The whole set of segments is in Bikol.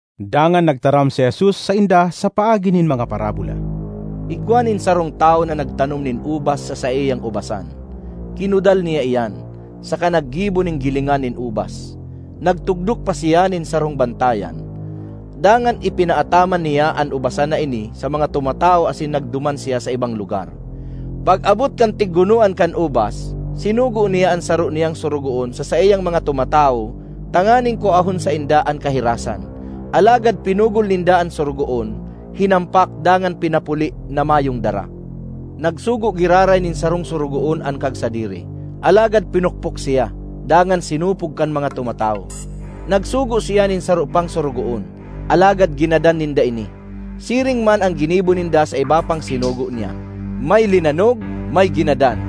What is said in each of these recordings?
Dangan nagtaram si Jesus sainda sa paagi nin mga parabola, “Igwa nin sarong tawo na nagtanom nin ubas sa saiyang ubasan, kinudal niya iyan, saka naggibo nin gilingan nin ubas. Nagtugdok pa siya nin sarong bantayan. Dangan ipinaataman niya an ubasan na ini sa mga tumatawo asin nagduman siya sa ibang lugar. Pag-abot kan tiggunoan kan ubas, sinugo niya an saro niyang sorogoon sa saiyang mga tumatawo tanganing kuahon sainda an kahirasan. Alagad pinugol ninda an sorogoon, hinampak dangan pinapuli na mayong dara. Nagsugo giraray nin sarong sorogoon an kagsadiri; alagad pinukpok siya, dangan sinupog kan mga tumatawo. Nagsugo siya nin saro pang sorogoon, alagad ginadan ninda ini. Siring man an ginibo ninda sa iba pang sinugo niya; may linanog, may ginadan.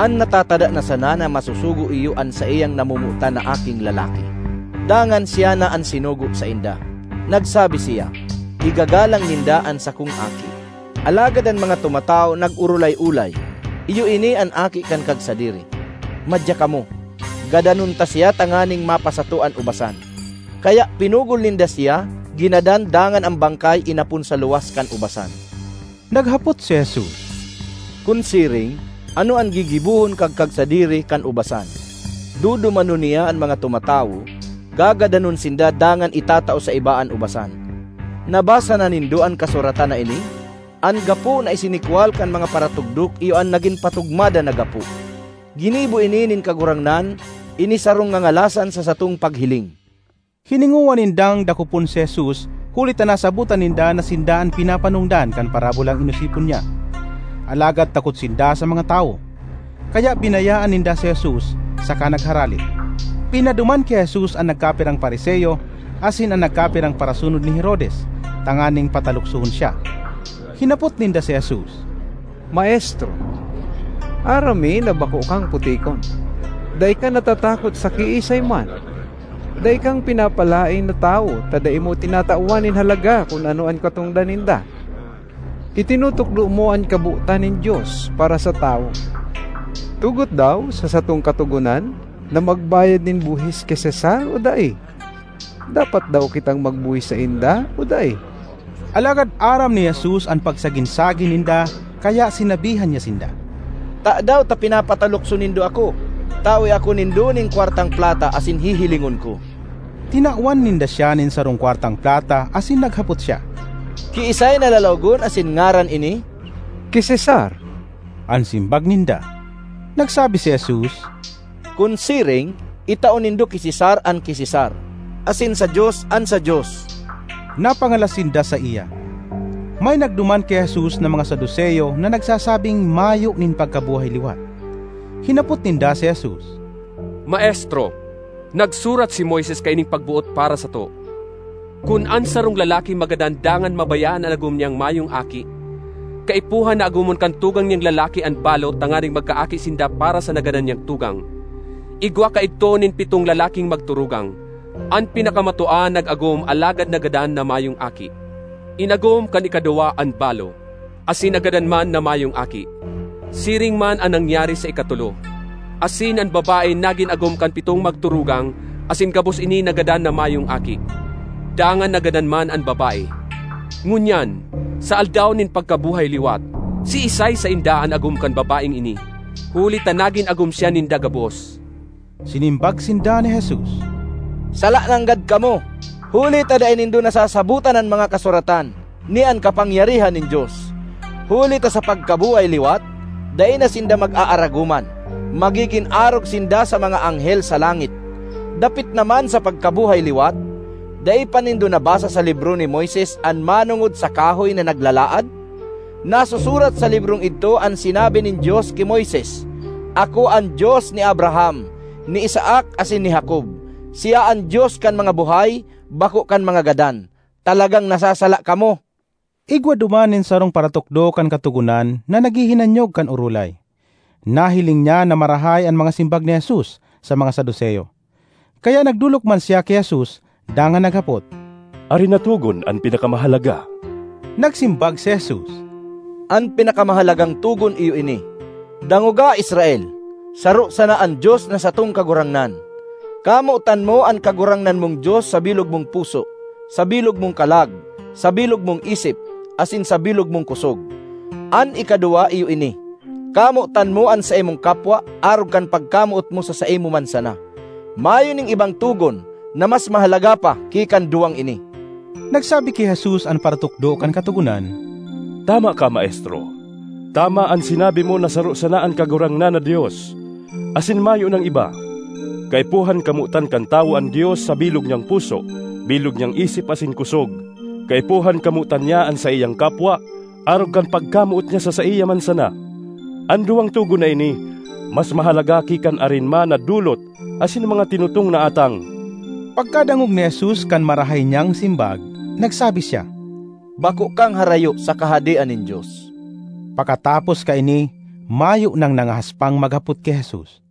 An natatada na sana na masusugo iyo an saiyang namomotan na aking lalaki; dangan siya na an sinugo sainda. Nagsabi siya, ‘Igagalang ninda an sakong aki.’ Alagad an mga tumatawo nag-orolay-olay, ‘Iyo ini an aki kan kagsadiri. Madya kamo, gadanon ta siya tanganing mapasato an ubasan!’ Kaya pinugol ninda siya, ginadan dangan an bangkay inapon sa luwas kan ubasan.” Naghapot si Jesus, “Kun siring, ano an gigibohon kan kagsadiri kan ubasan? Dudumanon niya an mga tumatawo, gagadanon sinda dangan itatao sa iba an ubasan. Nabasa na nindo an kasuratan na ini? ‘An gapo na isinikwal kan mga paratugdok iyo an nagin patugmadan na gapo. Ginibo ini nin Kagurangnan, ini sarong ngangalasan sa satong paghiling!’” Hiningowa nindang dakopon si Jesus huli ta nasabotan ninda na sinda an pinapanongdan kan parabolang inosipon niya. Alagad takot sinda sa mga tawo, kaya binayaan ninda si Jesus saka nagharale. Pinaduman ki Jesus an nagkapirang Fariseo asin an nagkapirang parasunod ni Herodes tanganing pataluksohon siya. Hinapot ninda si Jesus, “Maestro, aram mi na bako kang putikon; dai ka natatakot sa kiisay man. Dai kang pinapalaen na tawo ta dai mo tinatawan nin halaga kun ano an katongdan ninda. Itinutukdo mo an kabotan nin Dios para sa tawo. Tugot daw sa satong katogonan na magbayad nin buhis ki Cesar o dai? Dapat daw kitang magbuhis sainda o dai?” Alagad aram ni Jesus an pagsagin-sagin ninda kaya sinabihan niya sinda, “Tadaw ta pinapatalukso nindo ako? Tawe ako nindo nin kwartang plata asin hihilingon ko.” Tinawan ninda siya nin sarong kwartang plata asin naghapot siya, “Kiisay na lalawogon asin ngaran ini?” “Ki Cesar,” an simbag ninda. Nagsabi si Jesus, “Kun siring itao nindo ki Cesar an ki Cesar, asin sa Dios an sa Dios.” Napangalas sinda saiya. May nagduman ki Jesus na mga Saduceo na nagsasabing mayo nin pagkabuhay-liwat. Hinapot ninda si Jesus, “Maestro, nagsurat si Moises kaining pagboot para sato, ‘Kun an sarong lalaki magadan dangan mabayaan an agom niyang mayong aki, kaipuhan na agomon kan tugang niyang lalaki an balo tanganing magkaaki sinda para sa nagadan niyang tugang.’ Igwa kaidto nin pitong lalaking magturugang: an pinakamatua nag-agom alagad nagadan na mayong aki. Inagom kan ikaduwa an balo, asin nagadan man na mayong aki. Siring man an nangyari sa ikatolo; asin an babae nagin agom kan pitong magturugang asin gabos ini nagadan na mayong aki. Dangan nagadan man an babae. Ngunyan, sa aldaw nin pagkabuhay-liwat, siisay sainda an agom kan babaeng ini? Huli ta nagin agom siya ninda gabos!” Sinimbag sinda ni Jesus, “Sala nanggad kamo! Huli ta dai nindo nasasabotan an mga Kasuratan, ni an kapangyarihan nin Dios. Huli ta sa pagkabuhay-liwat dai na sinda mag-aaragoman; magigin arog sinda sa mga anghel sa langit. Dapit naman sa pagkabuhay-liwat, dai pa nindo nabasa sa libro ni Moises an manongod sa kahoy na naglalaad? Nasusurat sa librong idto an sinabi nin Dios ki Moises: ‘Ako an Dios ni Abraham, ni Isaac asin ni Jacob.’ Siya an Dios kan mga buhay, bako kan mga gadan. Talagang nasasala kamo!” Igwa duman nin sarong paratukdo kan Katogonan na naghihinanyog kan orolay. Nahiling niya na marahay an mga simbag ni Jesus sa mga Saduceo, kaya nagdolok man siya ki Jesus dangan naghapot, “Arin na togon an pinakamahalaga?” Nagsimbag si Jesus, “An pinakamahalagang togon iyo ini: ‘Dangoga, Israel! Saro sana an Dios na satong Kagurangnan. Kamotan mo an Kagurangnan mong Dios sa bilog mong puso, sa bilog mong kalag, sa bilog mong isip, asin sa bilog mong kosog.’ An ikaduwa iyo ini: ‘Kamotan mo an saimong kapwa arog kan pagkamoot mo sa saimo man sana.’ Mayo nin ibang togon na mas mahalaga pa ki kan duwang ini.” Nagsabi ki Jesus an paratukdo kan Katogonan, “Tama ka, Maestro; tama an sinabi mo na saro sana an Kagurangnan na Dios, asin mayo nang iba. Kaipuhan kamotan kan tawo an Dios sa bilog niyang puso, bilog niyang isip asin kosog; kaipuhan kamotan niya an saiyang kapwa arog kan pagkamoot niya sa saiya man sana. An duwang togon na ini mas mahalaga ki kan arin man na dolot asin mga tinutong na atang.” Pagkadangog ni Jesus kan marahay niyang simbag, nagsabi siya, “Bako kang harayo sa Kahadean nin Dios.” Pakatapos kaini, mayo nang nangahas pang maghapot ki Jesus.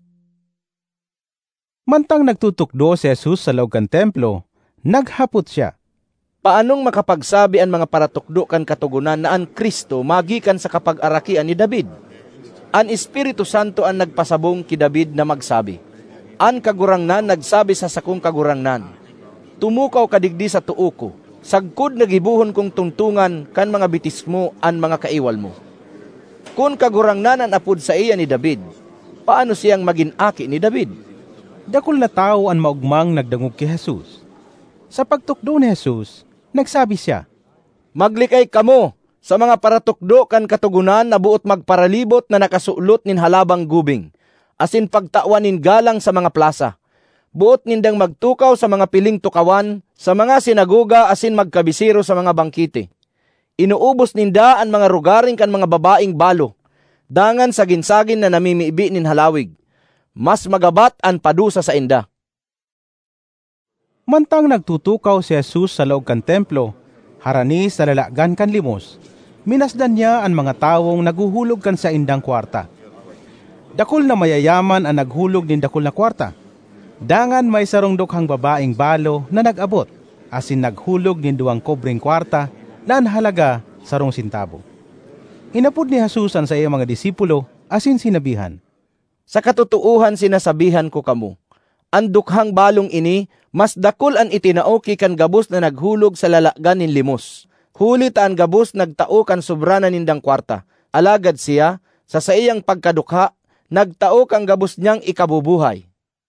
Mantang nagtutukdo si Jesus sa laog kan Templo, naghapot siya, “Paanong makapagsabi an mga paratukdo kan Katogonan na an Cristo magikan sa kapagarakian ni David? An Espiritu Santo an nagpasabong ki David na magsabi: ‘An Kagurangnan nagsabi sa sakong Kagurangnan: Tumukaw ka digdi sa too ko, sagkod na gibohon kong tungtongan kan mga bitis mo an mga kaiwal mo.’ Kun Kagurangnan an apod saiya ni David, paano siyang magin aki ni David?” Dakul na tawo an maogmang nagdangog ki Jesus. Sa pagtukdo ni Jesus, nagsabi siya, “Maglikay kamo sa mga paratukdo kan Katogonan na boot magparalibot na nakasulot nin halabang gubing, asin pagtawan nin galang sa mga plasa. Boot nindang magtukaw sa mga piling tukawan sa mga sinagoga asin magkabisero sa mga bangkete. Inuubos ninda an mga rogaring kan mga babaeng balo, dangan sagin-sagin na namimibi nin halawig. Mas magabat an padusa sainda!” Mantang nagtutukaw si Jesus sa laog kan Templo, harani sa lalagan kan limos, minasdan niya an mga tawong naghuhulog kan saindang kwarta. Dakul na mayayaman an naghulog nin dakul na kwarta. Dangan may sarong dukhang babaeng balo na nag-abot asin naghulog nin duwang kobreng kwarta na an halaga sarong sentabo. Inapod ni Jesus an saiyang mga disipulo asin sinabihan, “Sa katotoohan sinasabihan ko kamo, an dukhang balong ini mas dakul an itinao ki kan gabos na naghulog sa lalagan nin limos. Huli ta an gabos nagtao kan sobra na nindang kwarta, alagad siya, sa saiyang pagkadukha, nagtao kan gabos niyang ikabubuhay.”